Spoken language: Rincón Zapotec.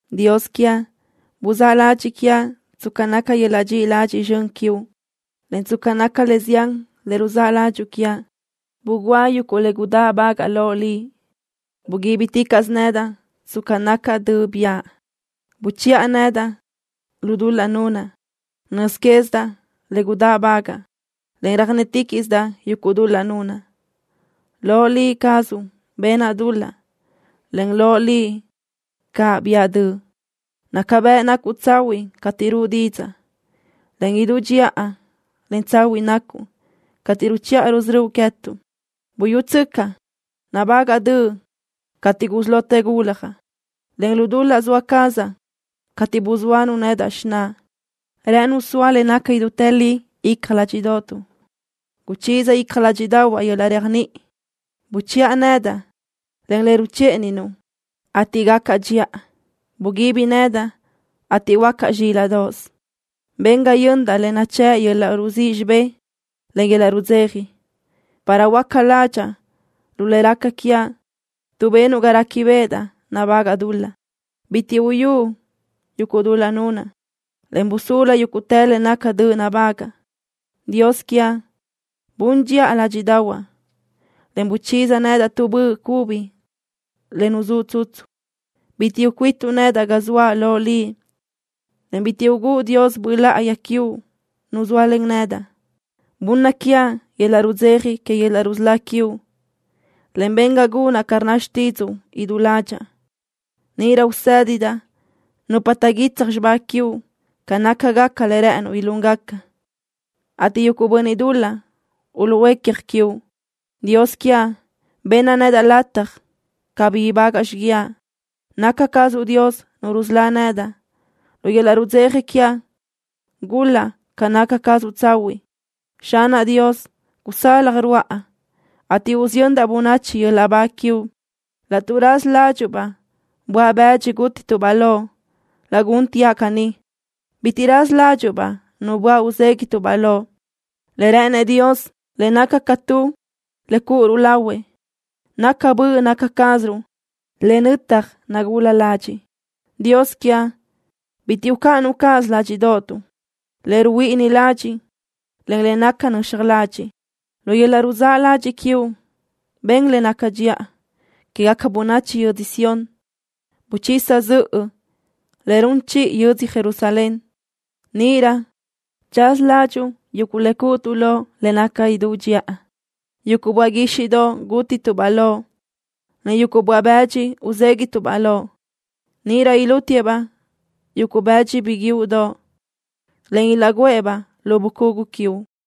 Dios quiaʼ, buzáʼ ladxiʼ quiaʼ tsca naca yöl-laʼ dxiʼi ladxiʼ zxön quiuʼ, en tsca naca le zián le ruzáʼ ládxuʼu quiaʼ, bugúa yuguʼ le gudáʼbagaʼa loʼ Liʼ. Buguíbiticaʼsö nedaʼ tsca naca döʼ biʼa. Buchiʼa nedaʼ lu dul-laʼ nunaʼ. Nöz quézidaʼ le gudáʼbagaʼa, en röjnétiquiʼsidaʼ yuguʼ dul-laʼ nunaʼ. Loʼ Liʼ cazuʼ benaʼ dul-laʼ, en loʼ Liʼ caʼ biʼa döʼ. Naca bëʼ nacuʼ tsahuiʼ cateʼ ruʼu didzaʼ, en idú dxiʼa, en tsahuiʼ nacuʼ cateʼ ruchiʼa rusörö́uʼ queë́tuʼ. Buyútsöcaʼ, nabágaʼa döʼ cateʼ gusí lotë guljaʼ, en lu dul-laʼ zoa cazaʼ cateʼ buzóanu xináʼa nedaʼ. Rë́ʼënuʼ soa le naca idútë li icja ládxiʼdoʼotuʼ. Guchiza icja ládxiʼdaʼahuaʼ yöl-laʼ réajniʼi. Buchiʼa nedaʼ len le ruchíʼaninuʼ, ateʼ gacaʼ dxiʼa. Buguibi nedaʼ, ateʼ huöácaʼ zxílaʼdoʼos. Ben ga yöndaʼ le nachë́ʼ yöl-laʼ ruzíʼ xibé, en yöl-laʼ rudzeja, para huöáca ládxaʼa lu le raca quiaʼ tuʼ benuʼ ga réquibeʼedaʼ nabágaʼa dul-laʼ. Bitiʼ uyúʼ yuguʼ dul-laʼ nunaʼ, en busulu yúguʼtë le naca döʼ nabágaʼa. Dios quiaʼ, bun dxiʼa ládxiʼdaʼahuaʼ, en guchiza nedaʼ tu böʼ cubi le nuzúʼ tsutsu. Bitiʼ ucuítuʼ nedaʼ ga zoaʼ loʼ Liʼ, en bitiʼ ugúʼ Dios Böʼ Láʼayi quiuʼ Nu zóalen nedaʼ. Bunna quiaʼ yöl-laʼ rudzeja que yöl-laʼ rusölá quiuʼ, en ben ga gunaʼ ca rnna xtídzuʼu idú ládxaʼa. Níʼirö usë́didaʼ nupa taʼguitsaj xibá quiuʼ ca nácagaca le rë́ʼënuʼ ilúngaca, ateʼ yuguʼ bönniʼ dul-laʼ uluʼhuécja quiuʼ. Dios quiaʼ, benna nedaʼ lataj cabí ibágaʼa xiguiaʼ. Naca cazuʼ Dios, Nu rusölá nedaʼ. Lu yöl-laʼ rudzeja quiaʼ gul-laʼ ca naca cazuʼ tsahuiʼ. Xanaʼ Dios, gusalaj ruáʼa, ateʼ usiyöndaʼ bönachi yöl-laʼ ba quiuʼ. Laʼtuʼ raza ládxuʼu-baʼ böaʼ-bëdxi gútituʼ-baʼ loʼ, laʼ gúnteaʼ caní. Bitiʼ raza ládxuʼu-baʼ nu böaʼ uzéguiʼtuʼ-baʼ loʼ. Le rë́ʼënëʼ Dios le naca ca tu le cúʼuruʼ lahuëʼ naca böʼ naca cáziruʼ le nötaj nagula ladxiʼ. Dios quiaʼ, bitiʼ ucáʼanuʼ cáʼasö ládxiʼdoʼotuʼ le ruhuíʼini ladxiʼ, en le naca nöxaj ladxiʼ. Lu yöl-laʼ ruzáʼ ladxiʼ quiuʼ ben le naca dxiʼa quégaca bönachi yödzö Sión. Buchisa zöʼö le run chiʼi yödzö Jerusalén. Níʼirö tsaza ládxuʼu yuguʼ le cúʼutuʼ loʼ le naca idú dxiʼa, yuguʼ böaʼ guíxiʼdoʼ gútituʼ-baʼ loʼ, en yuguʼ böaʼ-bë́dxidoʼ uzéguiʼtuʼ-baʼ loʼ. Níʼirö ilútiëʼ-baʼ yuguʼ bëdxi biguiúʼdoʼ, en ilaʼguʼë-baʼ lu bucugu quiuʼ.